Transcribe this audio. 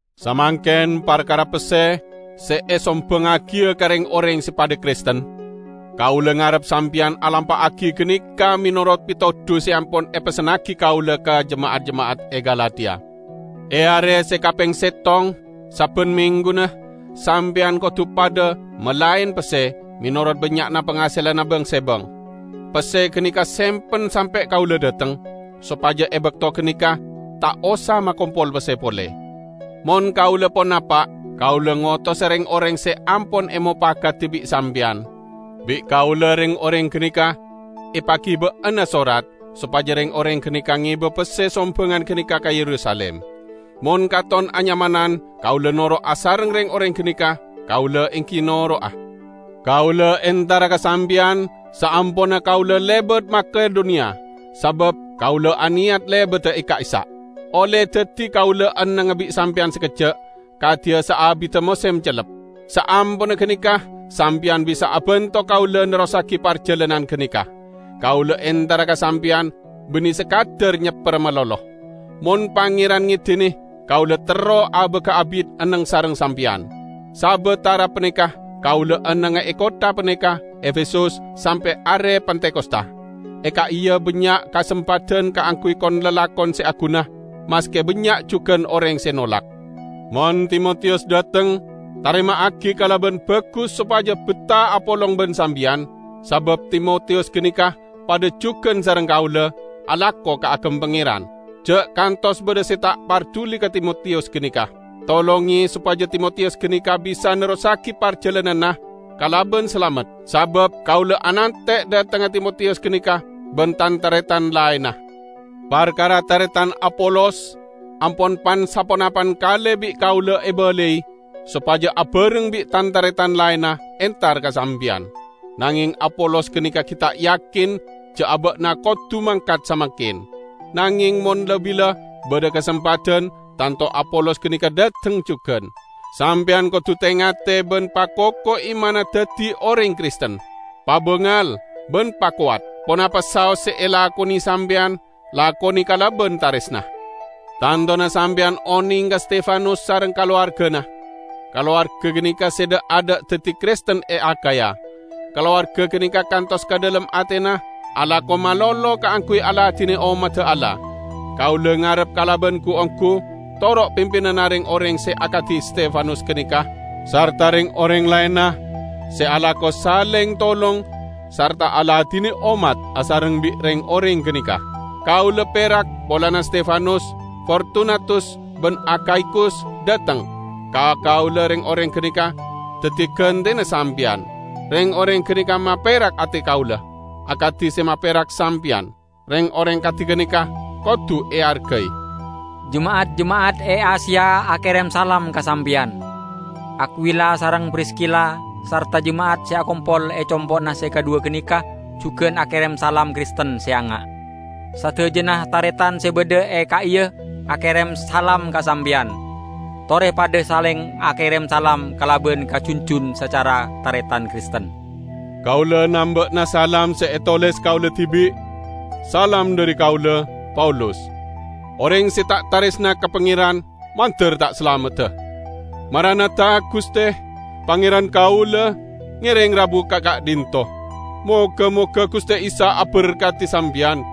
Samangken parkara pesse se esombangngagiya ka reng-oreng se padha Kristen, kaula ngarep sampeyan alampa'agi ganeka menorot petodu se ampon epessennagi kaula ka jema'at-jema'at e Galatia. E are se kapeng settong sabban mengguna sampeyan kodu padha malaen pesse, menorot bannya'na pangaselanna bang-sebang. Pesse ganeka sempen sampe' kaula dhateng, sopaja e bakto ganeka ta' osa makompol pesse pole. Mon kaula pon napa', kaula ngotosa reng-oreng se ampon emopakadi bi' sampeyan. Bi' kaula reng-oreng ganeka epagiba'ana sorat, sopaja reng-oreng ganeka ngeba pesse sombangan ganeka ka Yerusalim. Mon katon anyamanan kaula noro' asareng reng-oreng ganeka, kaula enggi noro'a. Kaula entara ka sampeyan saamponna kaula lebat Makedoniya, sabab kaula aneyat lebada e ka'issa'. Olle daddi kaula ennengnga bi' sampeyan sakejja', kadiya saabidda mosem cellep. Saamponna ganeka sampeyan bisa abanto kaula nerrossagi parjalanan ganeka. Kaula entara ka sampeyan banne sakadar nyepperra malolo. Mon Pangeran ngedine, kaula terro abaga abit enneng sareng sampeyan. Sabatara paneka kaula ennengnga e kottha paneka, Efesus, sampe' are Pentakosta. E ka'iya bannya' kasempadan kaangguy kon-lalakon se aguna, maske bannya' jugan oreng se nolak. Mon Timotiyus dhateng, tarema'agi kalaban bagus sopaja betta apolong ban sampeyan, sabab Timotiyus ganeka padha jugan sareng kaula, alako kaagem Pangeran. Ja' kantos badha se ta' parduli ka Timotiyus ganeka. Tolonge sopaja Timotiyus ganeka bisa nerrossagi parjalananna kalaban salamet, sabab kaula anante' dhatengnga Timotiyus ganeka ban tan-taretan laenna. Parkara taretan Apolos, ampon pan-saponapan kale bi' kaula ebalai sopaja abareng bi' tan-taretan laenna entar ka sampeyan. Nangeng Apolos ganeka gi' ta' yakin ja' aba'na kodu mangkat samangken. Nangeng mon la-bila badha kasempadan, tanto Apolos ganeka dhateng jugan. Sampeyan kodu te-ngate ban pakoko imanna daddi oreng Kristen. Pabangal, ban pakowat. Ponapa saos se elakone sampeyan, lakone kalaban taresna. Tantona sampeyan oneng ka Stefanus sareng kalowargana; kalowarga ganeka se dha'-adha' daddi Kristen e Akhaya. Kalowarga ganeka kantos ka dhalem atena alako malolo kaangguy aladine ommadda Allah. Kaula ngarep kalaban gu-onggu, toro' pimpinanna reng-oreng se akadi Stefanus ganeka, sarta reng-oreng laenna se alako saleng tolong sarta aladine ommat asareng bi' reng-oreng ganeka. Kaula perak polana Stefanus, Fortunatus ban Akhaikus dhateng; ka kaula reng-oreng ganeka daddi gantena sampeyan. Reng-oreng ganeka maperak ate kaula, akadi se maperak sampeyan. Reng-oreng kadi ganeka kodu eargai. Jema'at-jema'at e Asia akerem salam ka sampeyan. Akwila sareng Priskila sarta jema'at se akompol e compo'na se kadhuwa ganeka jugan akerem salam Kristen se anga'. Sadajana taretan se badha e ka'iya akerem salam ka sampeyan. Tore padha saleng akerem salam kalaban kajunjun sacara taretan Kristen. Kaula namba'ana salam se etoles kaula dibi': Salam dhari kaula, Paulus. Oreng se ta' taresna ka Pangeran, mandar ta' salamedda. Maranatha -- Guste, Pangeran kaula, ngereng rabu ka ka'dhinto'! Moga-moga Guste Isa aberkadi sampeyan.